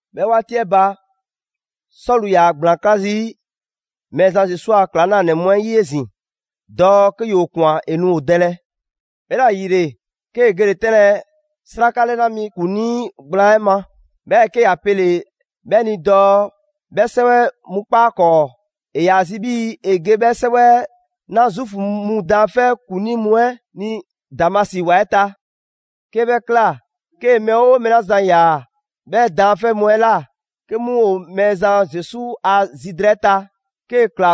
'Bhɛ 'waati 'ɛ ba, Sɔlu ‑yaa ‑gblaan ꞊kla zii' Mɛɛzan Zesu a ‑klaŋlanɛ mu 'ɛ 'yi 'ezin‑ dɔɔ 'ke ‑yoo ꞊kwan ‑e nu ‑o dɛlɛ. 'Bhɛla‑ ‑yile 'kee‑ gele‑ 'tɛnlɛ‑ 'sraka 'lɛna mi ‑kuŋlii gblaan 'ɛ ma. 'Bhɛɛ‑ 'ke ‑ya pele‑ 'bhɛ ni dɔɔ 'bhɛ 'sɛwɛ mu 'kpa 'a 'kɔɔ; ‑e ‑yaa zi 'bhii‑ ‑e ge 'bhɛ 'sɛwɛ 'ɛ 'na Zuufu mu daanfɛ' ‑kuŋlii mu 'ɛ ni Damasi ‑wa 'ɛ ta. 'Ke 'bhɛ ꞊kla 'kee‑ mɛɛ 'oo mɛɛ 'la zan ꞊ya 'bhɛ daanfɛ' mu 'ɛ ꞊la, 'ke 'mu ‑o Mɛɛzan Zesu a zi drɛɛ 'ɛ ta, 'kee‑ ꞊kla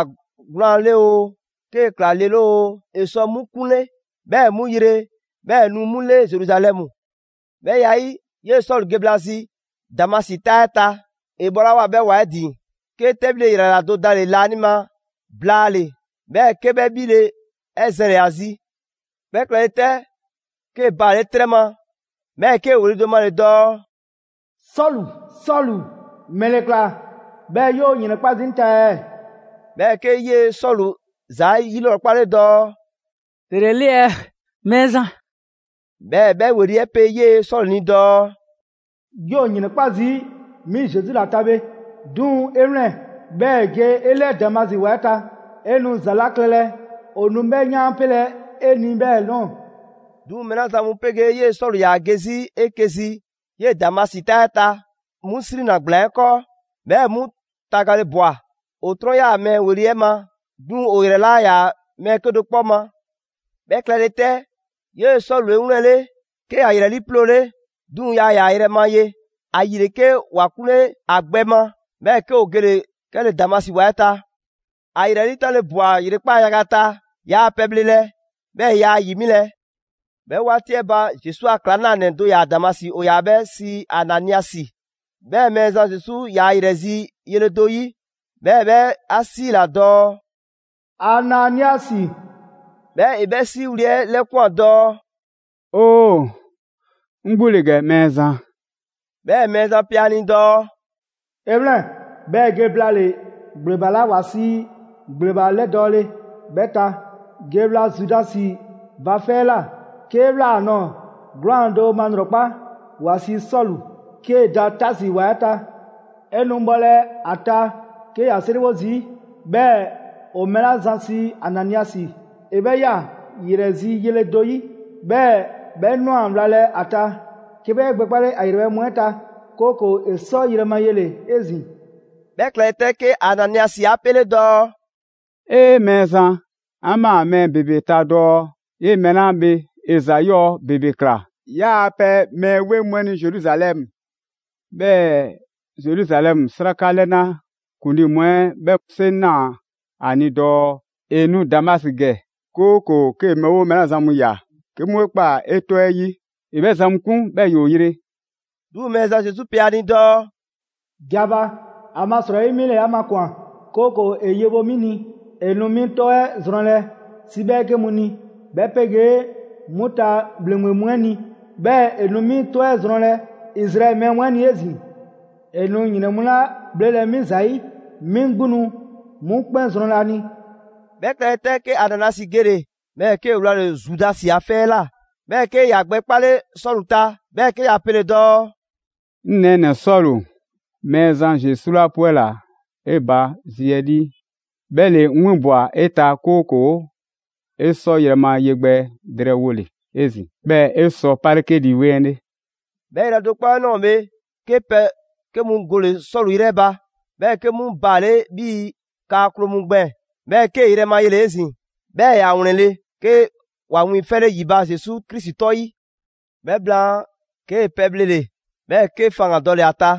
'gwlaan‑ 'le oo, 'kee‑ ꞊kla le 'le oo, ‑e sɔ 'mu 'kunle, 'bhɛɛ‑ ‑e 'mu yre; 'bhɛɛ‑ ‑e nu 'mu 'le Zeruzalɛmu. 'Bhɛ ya 'ɛ 'yi, 'yee‑ Sɔlu ge bhla zi Damasi 'taa 'ɛ ta, ‑e bhɔlawoa 'bhɛ ‑wa 'ɛ ‑din, 'ke 'tɛbhile ‑yrayra do dale‑ laanima blaale‑, 'bhɛɛ‑ 'ke 'bhɛ 'bhile‑ 'ɛ zɛnle‑ ‑a zi. 'Bhɛ klɛle 'tɛ, 'kee‑ baale' 'trɛ ma, 'bhɛɛ‑ 'kee‑ ‑weli' do male‑ dɔɔ: «Sɔlu, Sɔlu, ‑mɛle ‑kla, 'bhɛɛ‑ 'yoo‑ ‑yrɛnkpa' zii' 'ŋ ta ɛɛ?» 'Bhɛɛ‑ 'ke 'yee‑ Sɔlu ‑za 'yilrɔkpale dɔɔ: «‑Dele 'e 'le ɛɛ, Mɛɛzan?» 'Bhɛɛ‑ 'bhɛ ‑weli' 'ɛ pe 'yee‑ Sɔlu ni dɔɔ: «'Yoo‑ ‑yrɛnkpa' zii' 'mi Zesu ‑la ta bhe. 'Duŋ‑ 'e 'wlɛn‑, 'bhɛɛ‑ ge 'e 'lɛɛ Damasi ‑wa 'ɛ ta. 'E nu ‑za 'la klɛlɛ ‑o nu 'bhɛ 'yaanpelɛ 'e ni 'bhɛ ꞊nɔɔ.» 'Duŋ‑ mɛɛ 'la zan mu 'pegee 'yee‑ Sɔlu ‑yaa ge 'zi 'eke‑ zi 'yee‑ Damasi 'taa 'ɛ ta, 'mu 'srinna‑ ‑gblaan 'ɛ 'kɔɔ, 'bhɛɛ‑ 'mu tagale ꞊bwa. ‑O 'trɔn 'yaa‑ mɛɛ ‑weli' 'ɛ ma; 'duŋ‑ ‑o ‑yrɛ 'laa ‑yaa mɛɛ 'kedo‑ 'kpɔ ma. 'Bhɛ klɛle 'tɛ, 'yee‑ Sɔlu 'e 'wlɛnle‑, 'ke ‑ya ‑yrɛ 'liiploole; 'duŋ‑ yaa ‑yaa yrɛ ma ye. ‑Ayile 'ke ‑wa 'kunle ‑a gbɛ ma, 'bhɛɛ‑ 'ke ‑o gele‑ 'kɛle‑ Damasi ‑wa 'ɛ ta. ‑A ‑yrɛ 'liitanle ꞊bwa ‑yrekpaa' yaga ta, yaa pɛ bhlelɛ, 'bhɛɛ‑ yaa ‑yi 'milɛ‑. 'Bhɛ 'waati 'ɛ ba, Zesu a ‑klaŋlanɛ do ‑yaa Damasi, ‑o ‑yaa 'bhɛ sii Ananiasi. 'Bhɛ Mɛɛzan Zesu ꞊ya ‑yrɛ zi yele do 'yi, 'bhɛɛ‑ 'bhɛ 'a 'siila‑ dɔɔ: «Ananiasi!» 'Bhɛɛ‑ ‑e 'bhɛ 'siiwli‑ 'ɛ 'lɛkwan‑ dɔɔ: «Oo, 'ŋ 'gbu ‑le ‑gɛ, Mɛɛzan!» 'Bhɛɛ‑ Mɛɛzan pe ‑a ni dɔɔ: «'E 'wlɛn‑, 'bhɛɛ‑ ge blaale‑ ‑gbleba 'la ‑wa sii: ‹‑gbleba 'lɛdɔɔle› 'bhɛ ta. Ge wla Zudasi ba 'fɛ 'ɛ ꞊la. 'Kee‑ ꞊wlaa ‑a ꞊nɔɔ, 'gwlaan‑ do malrɔkpa, ‑wa sii Sɔlu, 'kee‑ da Taasi ‑wa 'ɛ ta. 'E nu bhɔlɛ ‑a ta 'ke ‑ya 'seriwo zii', 'bhɛɛ‑ ‑o mɛɛ 'la zan sii Ananiasi, ‑e 'bhɛ ꞊ya ‑yrɛ zi yele do 'yi. 'Bhɛɛ‑ 'bhɛ ꞊nwa wlalɛ ‑a ta, 'ke 'bhɛ 'e gbɛkpale ‑a ‑yrɛbhɛ' mu 'ɛ ta 'kooko‑ ‑e 'sɔ yrɛ ma yele‑ 'ezin‑.» 'Bhɛ klɛle 'tɛ, 'ke Ananiasi 'a 'pele dɔɔ: «'E! Mɛɛzan, 'an ꞊maa mɛɛ ‑bebe ta dɔɔ 'yee‑ mɛɛ 'la bhe ‑e ‑za 'yɔɔ‑ ‑bebe ꞊kla 'yaa‑ pɛ mɛɛ 'weŋ mu 'ɛ ni Zeruzalɛmu. 'Bhɛɛ‑ Zeruzalɛmu 'sraka 'lɛna ‑kuŋlii mu 'ɛ 'bhɛ 'seŋ ꞊naa ‑a ni dɔɔ ‑e nu Damasi ‑gɛ, 'kooko‑ 'kee‑ mɛɛ 'oo mɛɛ 'la zan mu ꞊ya 'ke 'mu 'e kpa 'e 'tɔ 'ɛ 'yi, ‑e 'bhɛ zan mu 'kun, 'bhɛɛ‑ ‑yoo yre.» 'Duŋ‑ Mɛɛzan Zesu pe a ni dɔɔ: «Ge a ba, ‑amasrɔyi 'mi ‑le 'a makwan‑, 'kooko‑ ‑e yewo 'mi ni; ‑e nu 'mi 'tɔ 'ɛ zrɔnlɛ 'si 'bhɛɛke mu ni, 'bhɛ 'pegee 'mu ta ‑bhleŋgbe mu 'ɛ ni; 'bhɛɛ‑ ‑e nu 'mi 'tɔ 'ɛ zrɔnlɛ Izraɛli mɛɛ mu 'ɛ ni 'ezin‑. ‑E nu ‑yrɛn mu 'la 'bhlelɛ‑ 'mi ‑zayi', 'mi 'gbu nu 'mu 'kpɛn zrɔnlɛ ‑a ni.» 'Bhɛ klɛle 'tɛ, 'ke Ananiasi gele‑, 'bhɛɛ‑ 'kee‑ wlale‑ Zudasi 'a 'fɛ 'ɛ ꞊la. 'Bhɛɛ‑ 'ke ‑ya gbɛ 'kpale Sɔlu ta, 'bhɛɛ‑ 'ke ‑ya pele‑ dɔɔ: «'Ŋ nɛɛnɛ‑ Sɔlu, Mɛɛzan Zesu 'la 'pwɛla‑ 'e ba zi 'ɛ 'lii, 'bhɛ ‑le 'ŋ 'winbwa‑ 'e ta, 'kooko‑ 'e sɔ yrɛ ma ye gbɛ drɛɛwole 'ezin‑, 'bhɛɛ‑ 'e sɔ 'pale 'ke Lii 'Weŋ 'ɛ 'le.» 'Bhɛ yrɛ do 'kpɔ 'ɛ ꞊nɔɔ bhe, 'ke pɛ 'ke mu gole‑ Sɔlu 'yrɛ ba, 'bhɛɛ‑ 'ke 'mu baale' 'bhii‑ kaa kloo mu gbɛɛn‑, 'bhɛɛ‑ 'kee‑ yrɛ ma yele‑ 'ezin‑. 'Bhɛɛ‑ ‑ya ‑wlɛnle', 'ke ‑wa wiiŋfɛle ‑yi ba Zesu Krisi 'tɔ 'yi. 'Bhɛ blaan, 'kee‑ pɛ bhlele‑, 'bhɛɛ‑ 'ke faŋgan‑ dɔle‑ ‑a ta.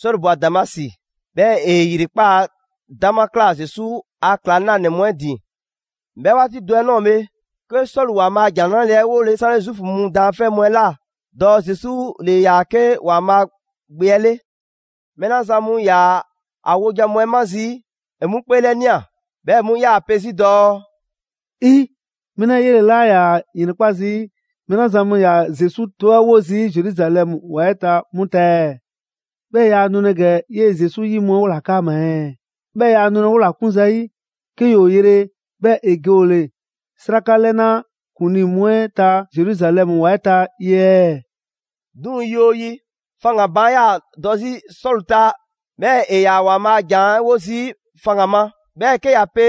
Sɔlu ꞊bwa Damasi, 'bhɛɛ‑ ‑e ‑yrekpaa' 'dama ꞊kla Zesu a ‑klaŋlanɛ mu 'ɛ ‑din. 'Bhɛ 'waati do 'ɛ ꞊nɔɔ bhe, 'ke Sɔlu ‑Waanbhaa' a ‑Jan 'Nrale‑ 'ɛ 'wole 'sanle Zuufu mu daanfɛ' mu 'ɛ ꞊la, dɔɔ Zesu ‑le ‑yaa 'ke ‑Waanbhaa' Gbe 'ɛ 'le. Mɛɛ 'la zan mu ‑yaa ‑a wojan mu 'ɛ 'ma zii', ‑e 'mu 'kpeelɛnia, 'bhɛɛ‑ 'mu 'yaa‑ pe 'zi dɔɔ: «Mɛɛ 'lɛɛ‑ 'yele‑ 'laa ‑yaa ‑yrɛnkpa' zii' mɛɛ 'la zan mu ‑yaa Zesu 'tɔ 'ɛ wo 'zi Zeruzalɛmu ‑wa 'ɛ ta 'mu ta ɛɛ? 'Bhɛɛ‑ yaa nulɛ ‑gɛ 'yee‑ Zesu 'yi mu 'ɛ 'wola‑ 'kaama‑ ɛɛ? 'Bhɛɛ‑ ‑yaa nulɛ 'wola‑ 'kun zayi', 'ke ‑yoo yre, 'bhɛɛ‑ ‑e ge ‑o ‑le 'sraka 'lɛ na ‑kuŋlii mu 'ɛ ta Zeruzalɛmu ‑wa 'ɛ ta ye ɛɛ?» 'Duŋ‑ yi 'oo yi, faŋgan‑ baan' 'yaa‑ dɔ 'zi Sɔlu ta; 'bhɛɛ‑ ‑e ‑yaa' ‑Waanbhaa' a ‑jan 'ɛ 'wo zii' faŋgan‑ ma. 'Bhɛɛ‑ 'kee‑ ‑yaa pe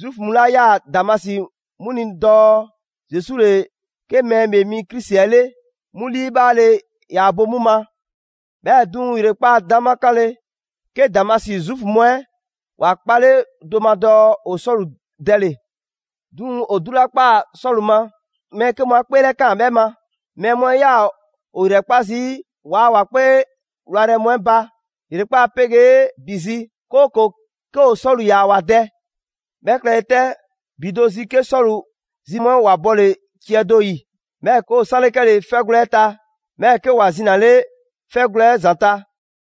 Zuufu mu 'la 'yaa‑ Damasi 'mu ni dɔɔ Zesu ‑le 'ke Mɛɛ ‑Bhee Mi Krisi 'ɛ 'le, 'mu 'liibhaale ‑yaa bo 'mu ma. 'Bhɛɛ‑ 'duŋ‑ ‑yrekpaa' 'dama 'kanle‑, 'ke Damasi Zuufu mu 'ɛ ‑wa 'kpale do ma dɔɔ ‑o Sɔlu dɛle‑. 'Duŋ‑ ‑o 'du 'la ꞊kpaa Sɔlu ma, mɛɛ 'ke mu 'a 'kpeelɛkaan 'bhɛ ma. Mɛɛ mu 'ɛ 'yaa‑ ‑o ‑yrɛkpa' zii' ‑waa' ‑wa 'kpee 'wlayrɛ‑ mu 'ɛ ba ‑yrekpaa' 'pegee ‑bi zi, 'kooko‑ 'ke ‑o Sɔlu ꞊ya ‑wa dɛ. 'Bhɛ klɛle 'tɛ ‑bi do zi, 'ke Sɔlu zi mu 'ɛ ‑wa bɔle ciɛ do 'yi, 'bhɛɛ‑ 'ke ‑o 'sanle 'kɛle‑ 'fɛgwlɛ‑ 'ɛ ta; 'bhɛɛ‑ 'ke ‑wa zinale 'fɛ gwlɛ 'ɛ ‑zanta'.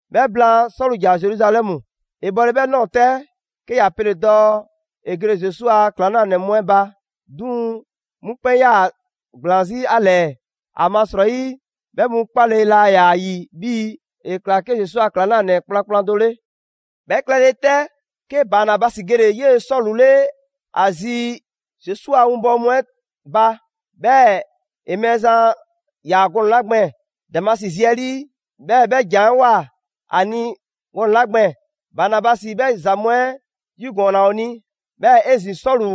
'Bhɛ blaan, Sɔlu ‑ja Zeruzalɛmu. ‑E bhɔle 'bhɛ ꞊nɔɔ 'tɛ, 'ke ‑ya pele‑ dɔɔ ‑e gele Zesu a ‑klaŋlanɛ mu 'ɛ ba; 'duŋ‑ 'mu 'kpɛn 'yaa‑ ‑gblaan 'zi ‑a ‑lɛɛ. ‑Amasrɔyi 'bhɛ mu 'kpale‑ laa ‑yaa ‑yi 'bhii‑ ‑e ‑kla 'ke Zesu a ‑klaŋlanɛ kplankplan do 'le. 'Bhɛ klɛle 'tɛ, 'ke Banabasi gele‑ 'yee‑ Sɔlu 'le ‑a zi Zesu a 'winbɔwo mu 'ɛ ba. 'Bhɛɛ‑ ‑e Mɛɛzan ꞊ya gɔnɛ‑ 'la gbɛɛn‑ Damasi zi 'ɛ 'lii, 'bhɛɛ‑ 'bhɛ ‑janwoa ‑a ni gɔnɛ‑ 'la gbɛɛn‑, Banabasi 'bhɛ ‑za mu 'ɛ 'yigɔɔnna ‑o ni. 'Bhɛɛ‑ 'ezin‑ Sɔlu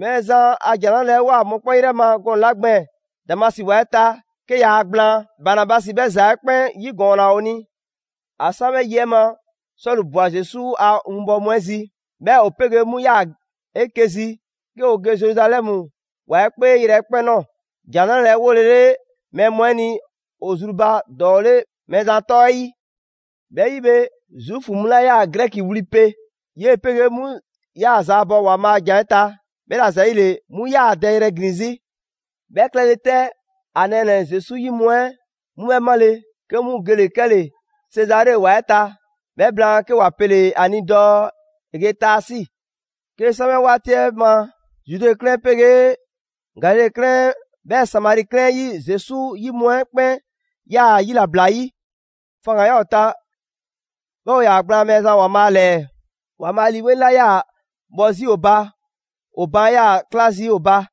Mɛɛzan a ‑Jan 'Nrale‑ 'ɛ ꞊woa mɔkpɛn' 'yrɛ ma gɔnɛ‑ 'la gbɛɛn‑ Damasi ‑wa 'ɛ ta 'ke yaa gblaan, Banabasi 'bhɛ ‑za 'ɛ 'kpɛn 'yigɔɔnna ‑o ni. ‑A 'san 'bhɛ yi 'ɛ ma, Sɔlu ꞊bwa Zesu a winbɔwo mu 'ɛ zi. 'Bhɛɛ‑ ‑o 'pegee 'mu ꞊yaa 'eke‑ zi 'ke ‑o ge Zeruzalɛmu ‑wa 'ɛ 'kpee yrɛkpɛn‑ ꞊nɔɔ, ‑Jan 'Nrale‑ 'ɛ 'wolele mɛɛ mu 'ɛ ni ‑o zru ba ‑dɔɔ 'le Mɛɛzan 'tɔ 'ɛ 'yi. 'Bhɛ 'yi bhe, Zuufu mu 'la ꞊yaa Grɛki wli pe, 'yee‑ 'pegee 'mu 'yaa‑ zaabɔ ‑Waanbhaa' a ‑jan 'ɛ ta; 'bhɛla‑ ‑za 'yile‑ 'mu ꞊yaa ‑a dɛ yrɛ ‑glin 'zi. 'Bhɛ klɛle 'tɛ, ‑a nɛɛnɛ‑ Zesu 'yi mu 'ɛ 'mu 'bhɛ 'male, 'ke 'mu gele‑ 'kɛle‑ Sezare ‑wa 'ɛ ta, 'bhɛ blaan 'ke ‑wa pele‑ ‑a ni dɔɔ ‑e ge Taasi. 'Kee‑ san 'bhɛ 'waati 'ɛ ma, Zude 'klɛɛn 'ɛ 'pegee Galile 'klɛɛn 'ɛ, 'bhɛɛ‑ Samari 'klɛɛn 'ɛ 'yi Zesu 'yi mu 'ɛ 'kpɛn 'yaa‑ yilabla 'yi. Faŋgan‑ ‑yaa ‑o ta, 'bhɛɛ‑ ‑o ‑yaa gblaan Mɛɛzan ‑Waanbhaa' ‑lɛɛ. ‑Waanbhaa' Lii 'Weŋ 'la 'yaa‑ bhɔ 'zi ‑o ba, ‑o baan' 'yaa‑ ꞊kla zii' ‑o ba.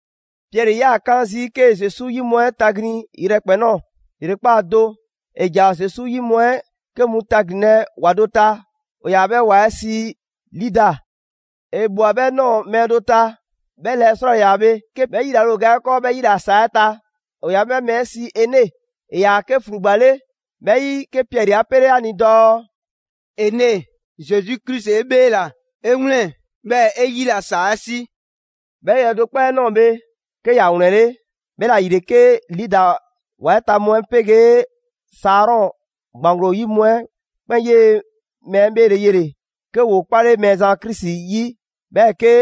Piɛri ‑yaa 'kaan zii' 'kee‑ Zesu 'yi mu 'ɛ taglin yrɛkpɛn‑ ꞊nɔɔ. ‑Yrekpaa' do, ‑e ‑ja Zesu 'yi mu 'ɛ 'ke mu taglinlɛ ‑wa do ta, ‑o ‑yaa 'bhɛ ‑wa 'ɛ sii Lida. ‑E ꞊bhwa 'bhɛ ꞊nɔɔ mɛɛ do ta. 'Bhɛ lɛɛ 'srwaa‑ ‑le ‑yaa bhe 'ke 'bhɛ yilale ‑o ga 'ɛ 'kɔɔ 'bhɛ 'yila‑ ‑saa 'ɛ ta. ‑O ‑yaa 'bhɛ mɛɛ 'ɛ sii Ene. ‑E ‑yaa 'ke ‑flugba 'le. 'Bhɛ 'yi, 'ke Piɛri 'a 'pele ‑a ni dɔɔ: «Ene, Zesu Krisi 'e 'bheela‑! 'E 'wlɛn‑ 'bhɛɛ‑ 'e 'yila‑ ‑saa 'ɛ 'si.» 'Bhɛ yrɛ do 'kpɔ 'ɛ ꞊nɔɔ bhe, 'ke ‑ya ‑wlɛnle'. 'Bhɛla‑ ‑yile, 'ke Lida ‑wa 'ɛ ta mu 'ɛ 'pegee Sarɔn ‑gbaŋglo 'yi mu 'ɛ 'kpɛn 'yee‑ mɛɛ 'ɛ 'bheele‑ yele‑, 'ke ‑woo 'kpale Mɛɛzan Krisi 'yi 'bhɛɛ‑ 'ke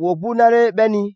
‑woo 'gbu 'nale‑ 'bhɛ ni.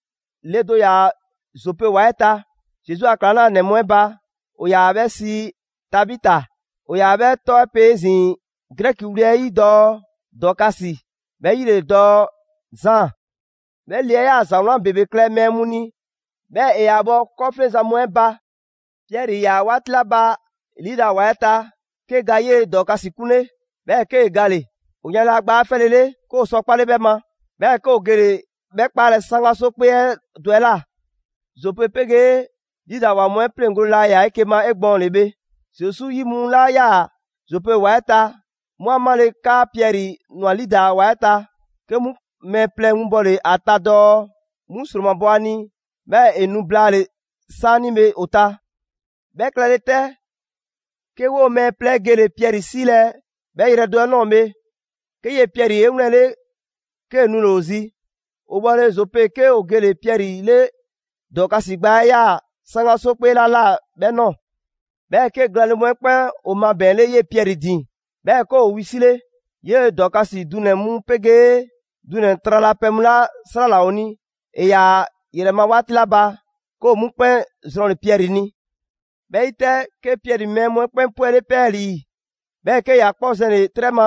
Le do ‑yaa Zope ‑wa 'ɛ ta Zesu a ‑klaŋlanɛ mu 'ɛ ba, ‑o ‑yaa 'bhɛ sii Tabita; ‑o ‑yaa 'bhɛ 'tɔ 'ɛ pe 'ezin‑ Grɛki wli 'ɛ 'yi dɔɔ Dɔɔkasi; 'bhɛ 'yi ‑le dɔɔ: «Zaan». 'Bhɛ le 'ɛ 'yaa‑ ‑za 'wlan ‑bebe klɛ mɛɛ mu ni 'bhɛɛ‑ ‑e ‑yaa bhɔ 'kɔɔfleŋzan mu 'ɛ ba. Piɛri ‑yaa 'waati 'la ba Lida ‑wa 'ɛ ta, 'ke ga 'yee‑ Dɔɔkasi 'kunle, 'bhɛɛ‑ 'kee‑ gale‑. ‑O yanle ‑a gbaa 'ɛ 'fɛlele, 'ke ‑o sɔ 'kpale 'bhɛ ma, 'bhɛɛ‑ 'ke ‑o gele‑ 'bhɛ 'kpaalɛ‑ 'saŋgaso 'kpee 'ɛ do ꞊la. Zope 'pegee Lida ‑wa mu 'ɛ 'pleŋgole 'la 'yaa‑ 'eke‑ ma 'egbɔɔnle bhe, Zesu 'yi mu 'la 'yaa‑ Zope ‑wa 'ɛ ta, 'mu 'a 'male‑ 'kaa Piɛri ꞊nwa Lida ‑wa 'ɛ ta, 'ke 'mu mɛɛ plɛ winbɔle ‑a ta dɔɔ 'mu ‑sromabɔ ‑a ni, 'bhɛɛ‑ ‑e nu blaale‑ 'saanibhe ‑o ta. 'Bhɛ klɛle 'tɛ, 'ke 'woo‑ mɛɛ plɛ 'ɛ gele Piɛri 'siilɛ‑ 'bhɛ yrɛ do 'ɛ ꞊nɔɔ bhe, 'ke 'yee‑ Piɛri 'e 'wlɛnle‑ 'kee‑ nule‑ ‑o zi. ‑O bhɔle Zope, 'ke ‑o gele Piɛri 'le Dɔɔkasi gbaa 'ɛ ꞊yaa 'saŋgaso 'kpee 'la ꞊la 'bhɛ ꞊nɔɔ. 'Bhɛɛ‑, 'ke glaanle mu 'ɛ 'kpɛn ‑o mabɛɛnle 'yee‑ Piɛri ‑din 'bhɛɛ‑ 'ke ‑o wisile. 'Yee‑ Dɔɔkasi dunɛ‑ mu 'pegee dunɛ‑ tralapɛ mu 'la 'srala‑ ‑o ni ‑e ‑yaa ‑a ‑yrɛ ma 'waati 'la ba, 'ke ‑o 'mu 'kpɛn zrɔnle‑ Piɛri ni. 'Bhɛ 'yi 'tɛ, 'ke Piɛri mɛɛ mu 'ɛ 'kpɛn 'pwɛle 'pɛɛlii‑, 'bhɛɛ‑ 'ke ‑ya 'kpɔ zɛnle‑ 'trɛ ma,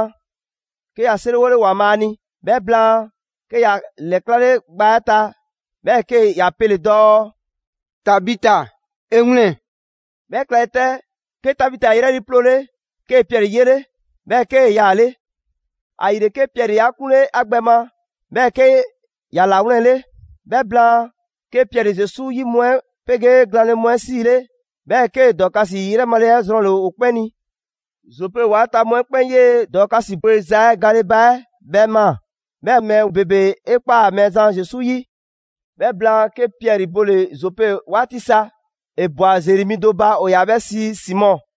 'ke ‑ya 'seriwole ‑Waanbhaa' ni. 'Bhɛ blaan, 'ke ‑ya ‑lɛklale gbaa 'ɛ ta, 'bhɛɛ‑ 'ke ‑ya pele‑ dɔɔ: «Tabita, 'e 'wlɛn‑!» 'Bhɛ klɛle 'tɛ, 'ke Tabita 'e 'yrɛ 'liiploole, 'kee‑ Piɛri 'yele, 'bhɛɛ‑ 'kee‑ yaale'. ‑Ayile, 'ke Piɛri 'a 'kunle ‑a gbɛ ma 'bhɛɛ‑ 'ke ‑ya ‑lawlɛnle. 'Bhɛ blaan, 'ke Piɛri Zesu 'yi mu 'ɛ 'pegee glaanle mu 'ɛ 'siile, 'bhɛɛ‑ 'kee‑ Dɔɔkasi 'yrɛ male 'ɛ zrɔnle‑ ‑o 'kpɛn ni. Zope ‑wa 'ɛ ta mu 'ɛ 'kpɛn 'yee‑ Dɔɔkasi bweza 'ɛ gale ba 'ɛ 'bhɛ ꞊maa; 'bhɛɛ‑ mɛɛ ‑bebe 'e ꞊kpaa Mɛɛzan Zesu 'yi. 'Bhɛ blaan, 'ke Piɛri bole‑ Zope 'waati sa. ‑E ꞊bwa ‑zeri mi do ba, ‑o ‑yaa 'bhɛ sii Simɔ.